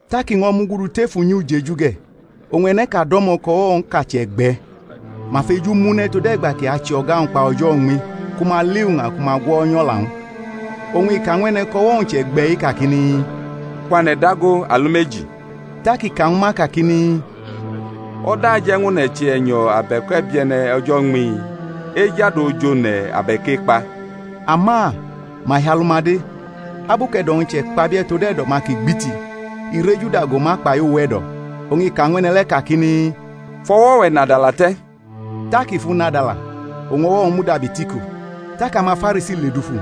Tak i ño̩ mugudu tef unyi ujeju ge̩; oñ e̩ne̩ʼka do̩mo̩ kʼo̩wo̩-wñʼka chʼe̩gbe̩. Ma fejumʼu ne̩ tode̩gba kʼi ache o̩ga-wñ kpa o̩jo̩ uñmi, ku ma li uña ku ma gwo̩nyʼo̩la-wñ. Oñ i ka ñw e̩ne̩ kʼo̩wo̩-wñ chʼe̩gbe̩-i, kakini, Kwane̩ dago alumeji. Tak i ka ñwu ma, kakini, O̩da aje̩ ñw one̩ che e̩nyo̩ abe̩k e̩bie̩ne̩ o̩jo̩ uñmi? Ejadu oji one̩, abe̩k ekpa? Ama ma hi alu-ma de. Abu kʼe̩do̩-wñ chʼe̩kpabie̩ tod e̩do̩-ma kʼi gbiti, i rejuda go ma kpai uwe̩do̩, oñ i ka ñw e̩ne̩ le̩ kakini, Fʼo̩wo̩-we̩ nadala te̩. Tak i fʼu nadala, oñ o̩wo̩-wñ mudabi tʼiko. Tak amaFarisi ledufu,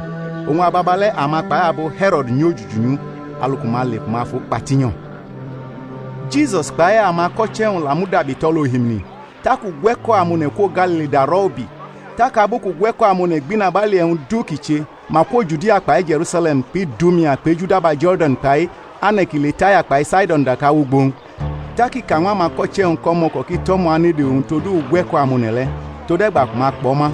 oñ ababale̩ ama kpai abo He̩ro̩d nyojuju nyʼu alu ku ma le ku ma fu kpa tinyo̩. Jisus kpai amako̩che̩-wñ la mudabi tʼo̩l ohimini; tak ugwe̩ko̩ amone̩ kwo Galili darʼo̩ ubi. Tak abu kʼugwe̩ko̩ amone̩ gbʼinabali e̩wñ du kʼi che, ma kwo Judia kpai Je̩rusale̩m kpʼIdumea kpʼejudaba Jo̩rdan, kpai ane̩ ki le Taya kpai Saido̩n daka wʼugbo-wñ. Tak i ka ñw amako̩che̩-wñ kʼo̩mo̩ko̩ ki tʼo̩mo̩ anede owñ todu ugwe̩ko̩ amone̩ le̩, tode̩gba ku ma kpʼo̩ ma;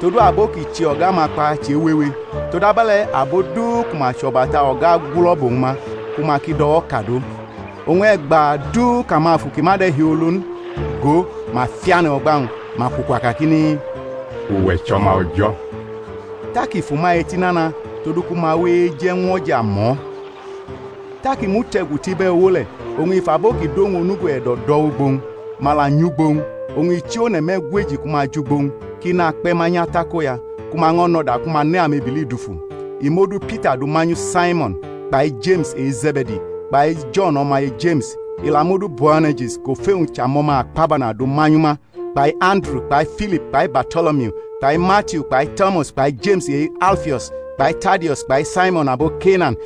todu abo kʼi che o̩ga-ma kpa che wewe; todabe̩le̩ abo du ku ma chʼo̩bata o̩ga gulo̩ bʼowñ ma, ku ma ki do̩wo̩kadʼo. Oñ e̩gba du kʼamafu ki ma de̩hiolo n, gʼo, ma fiane̩ o̩gba-wñ, ma kwukwa kakini, Uwe̩ chʼO̩ma O̩jo̩. Tak i fʼuma eti nana todu ku ma ki we eje̩ ñw o̩ja mʼo̩. Tak i mute̩gu tʼibe̩uwo le̩, oñ i fʼabo ki dʼowñ onugo e̩do̩ do̩ wʼugbo-wñ; ma la nyʼugbo-wñ. Oñ i chi one̩ me̩gweji ku ma jʼugbo-wñ, kʼi nakpe̩ ma nyʼatakoya, ku ma ño̩ nʼo̩da ku ma ne amebili dufu; i mʼodu Pita du manyu Saimo̩n; kpai Jeme̩s e-Ze̩be̩di kpai Jo̩n o̩maye Jeme̩s; i la mʼodu Boane̩rje̩s, kʼofe-wñ chʼAmo̩ma Akpabana, du manyu ma; kpai Anduru kpai Filip kpai Barto̩lomiu kpai Matiu kpai Tomas kpai Jeme̩s e-Alfio̩s kpai Tadio̩s kpai Saimo̩n abo Kenan,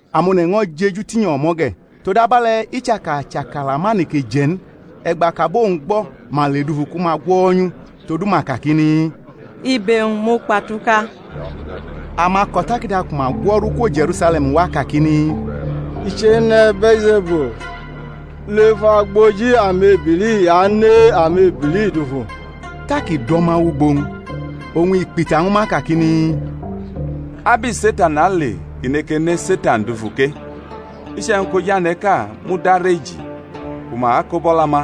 Amone̩ ño̩ jeju tinyo̩ o̩mo̩ ge̩, todabe̩le̩ i chaka chʼakala ma neke je̩ n. E̩gba kʼabo-wñ gbo̩, ma ledufu ku ma gwo̩nyʼu; todu ma kakini, Ibe-wñ mukpatuka. Amako̩takada ku ma gwo̩ru kwo Je̩rusale̩m wa kakini, I chene̩ Bee̩lze̩bul, lef agboji amebili i ane amebili dufu. Tak i do̩ ma wʼugbo-wñ, oñ i kpita ñwu ma kakini, Abu Setan ale kʼi neke ne Setan dufu ke? Iche̩wñ kʼojane̩ʼka mudareji ku ma kobʼo̩la-ma,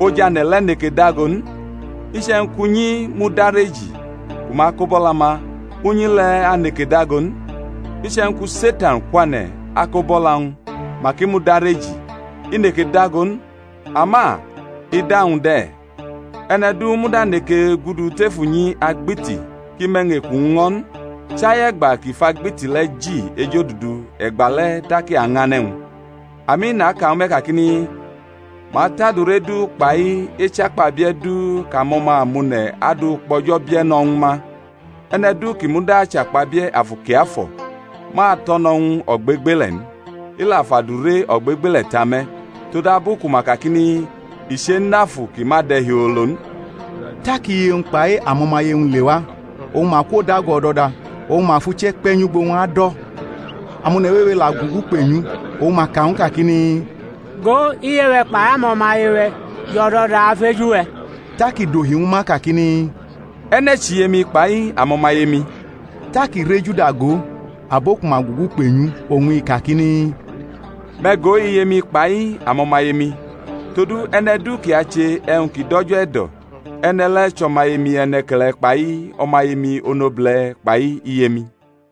ojane̩ le̩ neke dago n. Iche̩wñ kʼunyi mudareji ku ma kobʼo̩la-ma, unyi le̩ aneke dago n. Iche̩wñ ku Setan kwane̩ akobʼo̩la-wñ, kʼi mudareji, i neke dago n, ama ida-wñ de̩. E̩ne̩ du muda neke gudu tef unyi agbiti kʼi mʼe̩wñ-eku-wñ ño̩ n, chai e̩gba kʼi fʼagbiti le̩ ji ejodudu e̩gba le̩ tak i añʼane̩-wñ. Ami naka ñwu me̩ kakini, Ma atʼadure du kpai echakpabie̩ du kʼamo̩ma amone̩ adu kpʼO̩jo̩ bie̩ no̩ ñwu ma; e̩ne̩ du ki muda achakpabie̩ Afu Kiafo̩, ma ato̩no̩ ñw u ogbegbele̩ n, i la fʼadure ogbegbele̩ ta me̩; todabu ku ma kakini, I chenʼafu ki ma de̩hiolo n. Tak iye-wñ kpai amo̩maye-wñ lewa, oñ ma kwodago o̩do̩da, oñ ma fʼuche̩ kpe̩ nyʼugbo-wñ adʼo̩. Amone̩ wewe la gugu kpenyʼu, oñ ma ka ñw u kakini, Go, iye-we̩ kpai amo̩maye-we̩ jʼo̩do̩da afeju we̩. Tak i dohi ñwu ma kakini, E̩ne̩ chʼiye-mi kpai amo̩maye-mi? Tak i rejuda go abo ku ma gugu kpenyʼu, oñ i kakini, Me̩ go iye-mi kpai amo̩maye-mi! Todu e̩ne̩ du ki ache e̩wñ ki dʼO̩jo̩ e̩do̩, e̩ne̩ le̩ chʼo̩maye-mi e̩ne̩ke̩le̩ kpai omaye-mi onobule̩ kpai iye-mi.